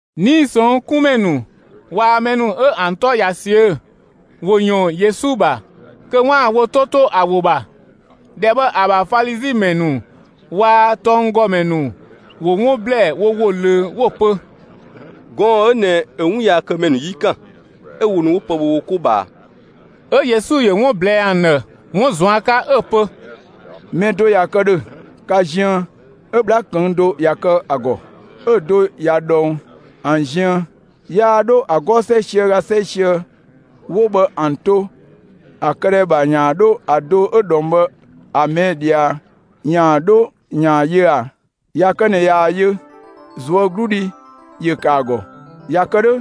'Nii‑ ꞊sɔnng' 'kun ‑mɛ ‑nu waa‑ mɛ ‑nu 'ö ‑an 'tɔ ꞊ya ꞊siö'‑, ‑wo ‑yɔɔn Yesu ‑bha kö 'waan‑ wo 'to 'to ‑a ‑wo ‑bha. ‑Dhɛ bhë ‑a ‑bha Falizi ‑mɛ ‑nu waa‑ tɔnggɔmɛ ‑nu ‑wo 'wun ꞊blɛɛ wo ‑wo ꞊löö 'wo‑ pö: «Gɔɔn‑ 'ö ꞊nɛ ‑yö 'wunyaakëmɛ ‑nu 'yi ‑kan, 'ö wo ‑nu 'wo pë ‑bhö wo 'ko ꞊bhaa.» 'Ö Yesu ‑yö 'wun ꞊blɛɛ ‑an ‑dhë 'wun ꞊zuan' 'ka 'ö‑ pö: «Mɛ do ꞊ya kë ‑dhö ka ziën 'ö 'bhla ꞊këng' do ꞊ya kë ‑a ‑gɔ, 'ö‑ do ꞊ya ꞊dhɔng ‑an ziën, yaa 'dho ‑a 'gɔɔ‑ 'sɛisië ö ga 'sɛisië 'wo bhë ‑an to ‑an këdhɛ ‑bha ‑yaan 'dho ‑a do 'ö ꞊dhɔng bhë ‑a ꞊mɛɛ' ꞊dhia ‑yaan 'dho ‑yaan ‑a yö ꞊a? ꞊Ya kë ꞊nɛ ꞊yaa‑ yö, ꞊zuögludhi ‑yö ‑kë ‑a ‑gɔ, ꞊ya kë 'dhö,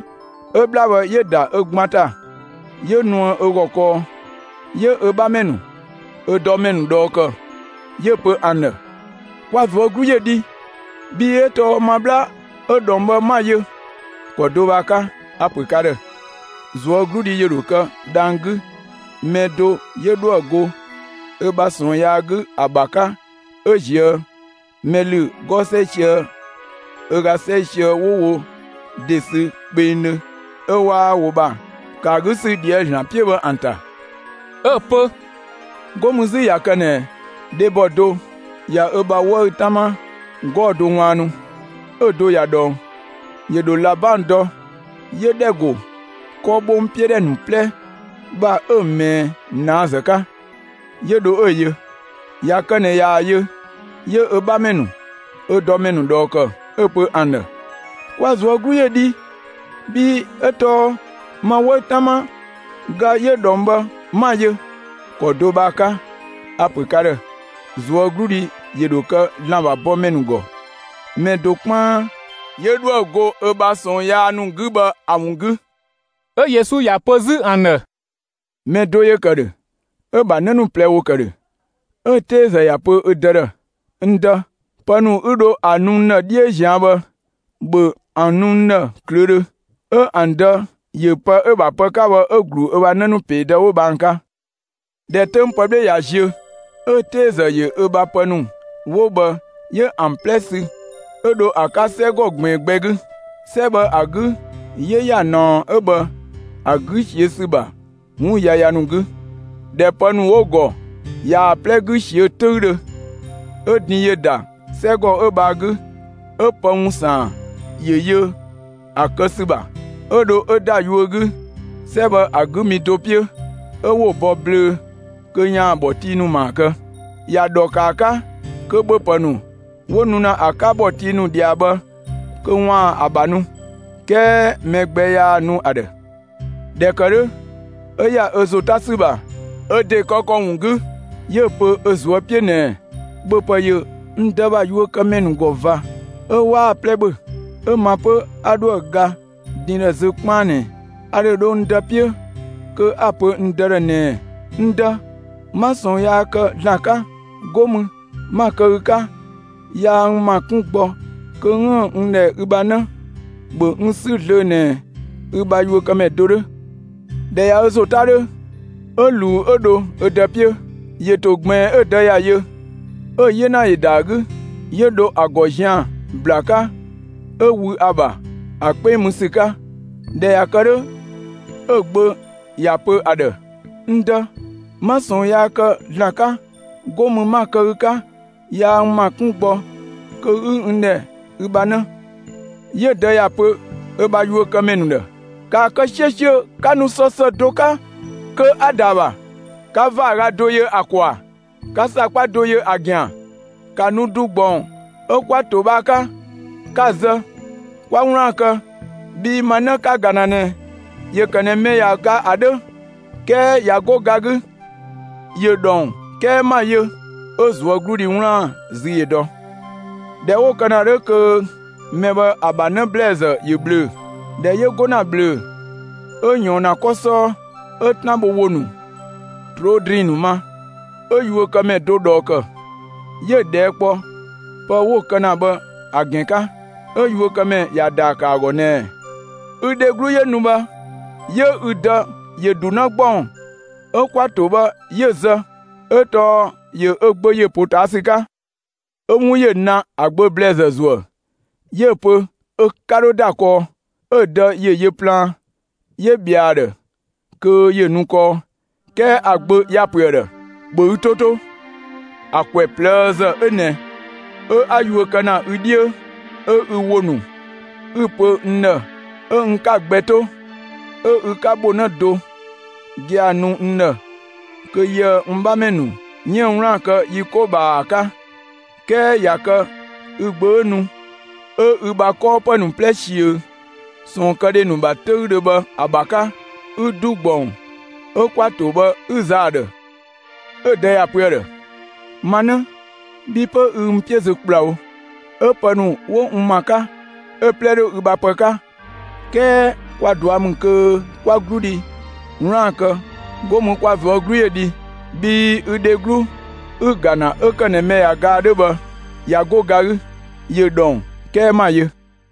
'ö 'bhla bhë 'yö ‑da ö ‑gban ‑ta, 'yö nuë ö ‑gɔ kɔɔ, 'yö ö 'bhamɛ ‑nu, ö dɔmɛ ‑nu ꞊dhɔɔ ‑kë 'yö‑ pö ‑an ‑dhë: ‹‑Kwa ꞊zuö' 'glu ‑yö dhi, bhii 'ö tɔɔ ma 'bhla 'ö ꞊dhɔng bhë 'ma‑ yö!› ‑Kɔ do bhë ‑a 'ka, a‑ ‑pö ka ‑dhë: ꞊Zuögludhi ‑yö ‑dho kë dhang‑ 'gü mɛ do 'yö 'dhoë‑ go ö bha ꞊sɔɔn yaa 'gü ‑a ‑bha 'ka 'ö ‑ziö mɛ ‑lü 'gɔɔ‑ 'sɛisië ö ga 'sɛisië 'wo wo ‑de ‑sü kpengdhö 'ö 'waa wo ‑bha ‑kë ‑a 'gü ‑sü ꞊dhië' ‑Zlan 'piö bhë ‑an ‑ta!» 'Ö‑ pö: «'Go mü 'zü ꞊ya kë ꞊nɛ dhebɔ do ꞊ya ö bha 'wëü‑ 'tama 'gɔɔ‑ do ꞊waannu, 'ö‑ do ꞊ya ꞊dhɔng, ‑yö ‑dho ꞊labang dɔ 'yö ‑dhɛ ‑go 'kɔbhongtodhɛ ‑nu 'plɛ ‑bha 'ö‑ ꞊mɛɛ ꞊naazë 'ka, 'yö dho 'ö‑ yö. ꞊Ya kë ꞊nɛ ꞊yaa‑ yö, 'yö ö 'bhamɛ ‑nu, ö dɔmɛ ‑nu ꞊dhɔɔ ‑kë 'ö‑ pö ‑an ‑dhë: ‹Kwa ꞊zuö' 'glu ‑yö dhi, bhii 'ö tɔɔ ma 'wëü‑ 'tama ga 'yö ꞊dhɔng bhë, 'ma‑ yö!› ‑Kɔ do bhë ‑a 'ka, a‑ ‑pö ka ‑dhë: ꞊Zuögludhi ‑yö ‑dho kë ‑Zlan ‑bha bɔmɛ ‑nu ‑gɔ, mɛ do 'kpaan 'yö 'dhoë‑ go ö bha ꞊sɔɔn yaa ‑nu 'gü bhë ‑a ‑wun 'gü!» 'Ö Yesu ‑ya pö 'zü ‑an ‑dhë: «Mɛ do ‑yö ‑kë ‑dhö, 'ö‑ ‑bha 'në ‑nu ꞊plɛ ‑wo ‑kë ‑dhö. 'Ö‑ 'teezë ‑ya pö ö dë ‑dhë: ‹N dë, pë ‑nu 'ü dho ‑a nu n ‑dhë 'dhiö ꞊zian' bhë, ‑bhö ‑an nu n ‑dhë ꞊klöödhö!› 'ö ‑an dë ‑yö pë 'ö‑ ‑bha pë 'ka bhë 'yö‑ ‑glu ö bha 'në ‑nu ‑peedë 'wo bhë ‑an 'ka. ꞊Dhɛ 'töng pë 'bhle ꞊ya ziö, 'ö‑ 'teezë ‑yö ö bha pë ‑nu 'wo bhë 'yö ‑an 'plɛ sü, 'yö dho ‑a 'ka 'sɛgɔ ꞊gbiin gbɛ 'gü. 'Sɛ bhë ‑a 'gü 'yö ‑ya ꞊naɔ 'ö bhë ‑a 'gü ꞊siö' ‑sü ‑bha 'wun yaya ‑nu 'gü. ꞊Dhɛ pë ‑nu 'wo‑ ‑gɔ ꞊yaa‑ 'plɛ 'gü ꞊siö' 'töüdhö, 'ö din ‑yö ‑da 'sɛgɔ 'ö bhë ‑a 'gü, 'ö pë ‑wun ‑saan ‑yö yö ‑a kë ‑sü ‑bha. 'Ö dho 'ö ‑da yuö 'gü 'sɛ bhë ‑a 'gü mi do 'piö, 'ö 'wo‑ bɔ ꞊bhlöö‑ kö ‑yaan ‑bhɔtii ‑nu ‑maa kë. ‑Ya ‑dhɔ ‑kë ‑a 'ka kö ‑bhöpë ‑nu 'wo‑ nu ‑na ‑a 'ka ‑bhɔtii ‑nu ꞊dhia bhë kö ‑waan ö ‑bha nu, 'kɛɛ mɛ gbɛ 'yaa‑ nu ‑a ‑dhë. ꞊Dhɛ ‑kë 'dhö, 'ö ‑ya ö ‑zo 'ta ‑sü ‑bha ö ‑de kë ‑kɔ ‑wun 'gü, 'yö‑ pö ö ꞊zuö' 'piö ꞊nɛɛ: ‹‑Bhöpë ‑yö n dë ‑bha yuökëmɛ ‑nu ‑gɔ ꞊va, 'ö 'waa‑ 'plɛ ‑bhö, 'ö ma 'pö 'a 'dhoë‑ ga din ‑dhë zö 'kpaan ꞊nɛ! A ‑dho dho n dë 'piö kö 'a‑ pö ‑a ‑dhë ꞊nɛɛ: N dë, 'ma ꞊sɔɔn yaa kë ‑Zlan 'ka, 'go mü, 'ma‑ kë ü 'ka, yaa n ‑ma 'kun gbɔ kö 'üën‑ n ‑dhɛ ü bha 'në, ‑bhö n 'sü zlöö ꞊nɛ ü bha yuökëmɛ do 'dhö!› ꞊Dhɛ ꞊ya ö ‑zo 'ta 'dhö, 'ö ꞊luu 'ö dho ö dë 'piö. ‑Yö ‑to ꞊gbiin, 'ö‑ dë ‑ya yö, 'ö‑ 'yena ‑yö ‑da ‑a 'gü, 'yö dho ‑a ‑gɔ zian‑ ‑bla 'ka 'ö wü ‑a ‑bha ‑a 'kpeng mü ‑sü 'ka. ꞊Dhɛ ꞊ya kë 'dhö, 'ö‑ gbö ‑ya pö ‑a ‑dhë: ‹N dë, 'ma ꞊sɔɔn yaa kë ‑Zlan 'ka, 'go mü 'ma‑ kë ü 'ka, yaa n ‑ma 'kun gbɔ kö 'ü n ‑dhɛ ü bha 'në!› 'Yö‑ dë ‑ya ‑pö ö bha yuökëmɛ ‑nu ‑dhë: ‹‑Kaa kë 'siösiö 'ka nu sɔ ‑së do 'ka kö 'a‑ ‑da ‑a ‑bha, 'ka ‑vaaga do yö ‑a ‑kɔ ‑bha, 'ka ‑sakpa ‑nu yö ‑a ‑gɛn ‑bha! ‑Ka nu ‑du ‑gbɔng 'ö 'kwa‑ ‑to bhë ‑a 'ka, 'ka‑ zë, 'kwa 'wlaan‑ kë! Bhii ma 'në 'ka‑ ‑ga ‑na ꞊nɛ, ‑yö ‑kë ꞊nɛ mɛ ꞊ya ga ‑a 'dhö, 'kɛɛ ꞊ya 'go ga 'gü; ‑yö ‑dhɔng 'kɛɛ 'ma‑ yö!› 'Ö ꞊zuögludhi 'wlaan‑ zü ‑yö dɔ. ꞊Dhɛ 'wo‑ kë ‑na 'dhö kö mɛ bhë ‑a ‑bha 'në ‑blɛɛzë ‑yö ꞊bhlöö‑. ꞊Dhɛ 'yö 'go ‑na ꞊bhlöö‑, 'ö ꞊yɔɔn ‑na 'kɔ 'sɔɔ, 'ö 'tan bho ‑wo ‑nu, ꞊troo' ‑drinng ‑nu ma. 'Ö yuökëmɛ do ꞊dhɔɔ ‑kë, 'yö‑ ꞊dhɛɛ' kpɔ pë 'wo‑ kë ‑na bhë ‑a ‑gɛn 'ka. 'Ö yuökëmɛ ‑ya ‑daa ‑kë ‑a ‑gɔ ꞊nɛɛ: ‹Ü dheglu 'yö nu bhë, 'yö ü dë ‑yö ‑du 'në ‑gbɔng 'ö 'kwa‑ ‑to bhë 'yö‑ zë, 'ö tɔɔ ‑yö ö gbö ‑yö ‑potaasü 'ka.› 'Ö 'wun ‑yö na ‑a gbö ‑blɛɛzë ‑zuë, 'yö‑ pö ö 'ka 'dho ‑da kɔɔ. 'Ö‑ dë ‑yö yö plaan, 'yö ꞊bhɛa ‑a ‑dhë kö ‑yö nu kɔɔ. 'Kɛɛ ‑a gbö ‑ya ‑pö ‑a ‑dhë: ‹‑Bhö ü 'to 'to, ‑a ‑kwɛ ꞊plëëzë 'ö ꞊nɛ 'ö 'a yuö kë ‑na ü 'dhiö, 'ö ü ‑wo ‑nu 'ü‑ pö n ‑dhë 'ö n 'ka‑ gbɛ 'to, 'ö ü 'ka ‑bho 'në do gia‑ nu n ‑dhë kö yië‑ n 'bhamɛ ‑nu 'yiën‑ 'wlaan‑ kë yi 'ko ꞊bhaa ‑a 'ka, 'kɛɛ ꞊ya kë ü gbö 'ö nu, 'ö ü bha 'kɔɔpë ‑nu 'plɛ ꞊siö ꞊sɔɔnkëdhe ‑nu ‑bha 'töüdhö bhë ‑a ‑bha 'ka, 'ü ‑du ‑gbɔng 'ö 'kwa‑ ‑to bhë 'ü‑ zë ‑a ‑dhë!› 'Ö‑ dë ‑ya pö ‑a ‑dhë: ‹Ma 'në, bhi 'pö ü n 'piö zö ‑kplawo, 'ö pë ‑nu 'wo n ‑ma 'ka, 'ö‑ 'plɛ 'dhö ü bha pë 'ka. 'Kɛɛ kwa ꞊dua' ‑mü kö 'kwa ꞊zuögludhi 'wlaan‑ kë, 'go mü kwa ꞊zuö' 'glu ‑yö dhi, bhii ü dheglu 'ü‑ ‑ga ‑na 'ö ‑kë ꞊nɛ mɛ ꞊ya ga ‑a 'dhö bhë, ꞊ya 'go ga 'gü, ‑yö ‑dhɔng 'kɛɛ 'ma‑ yö!›»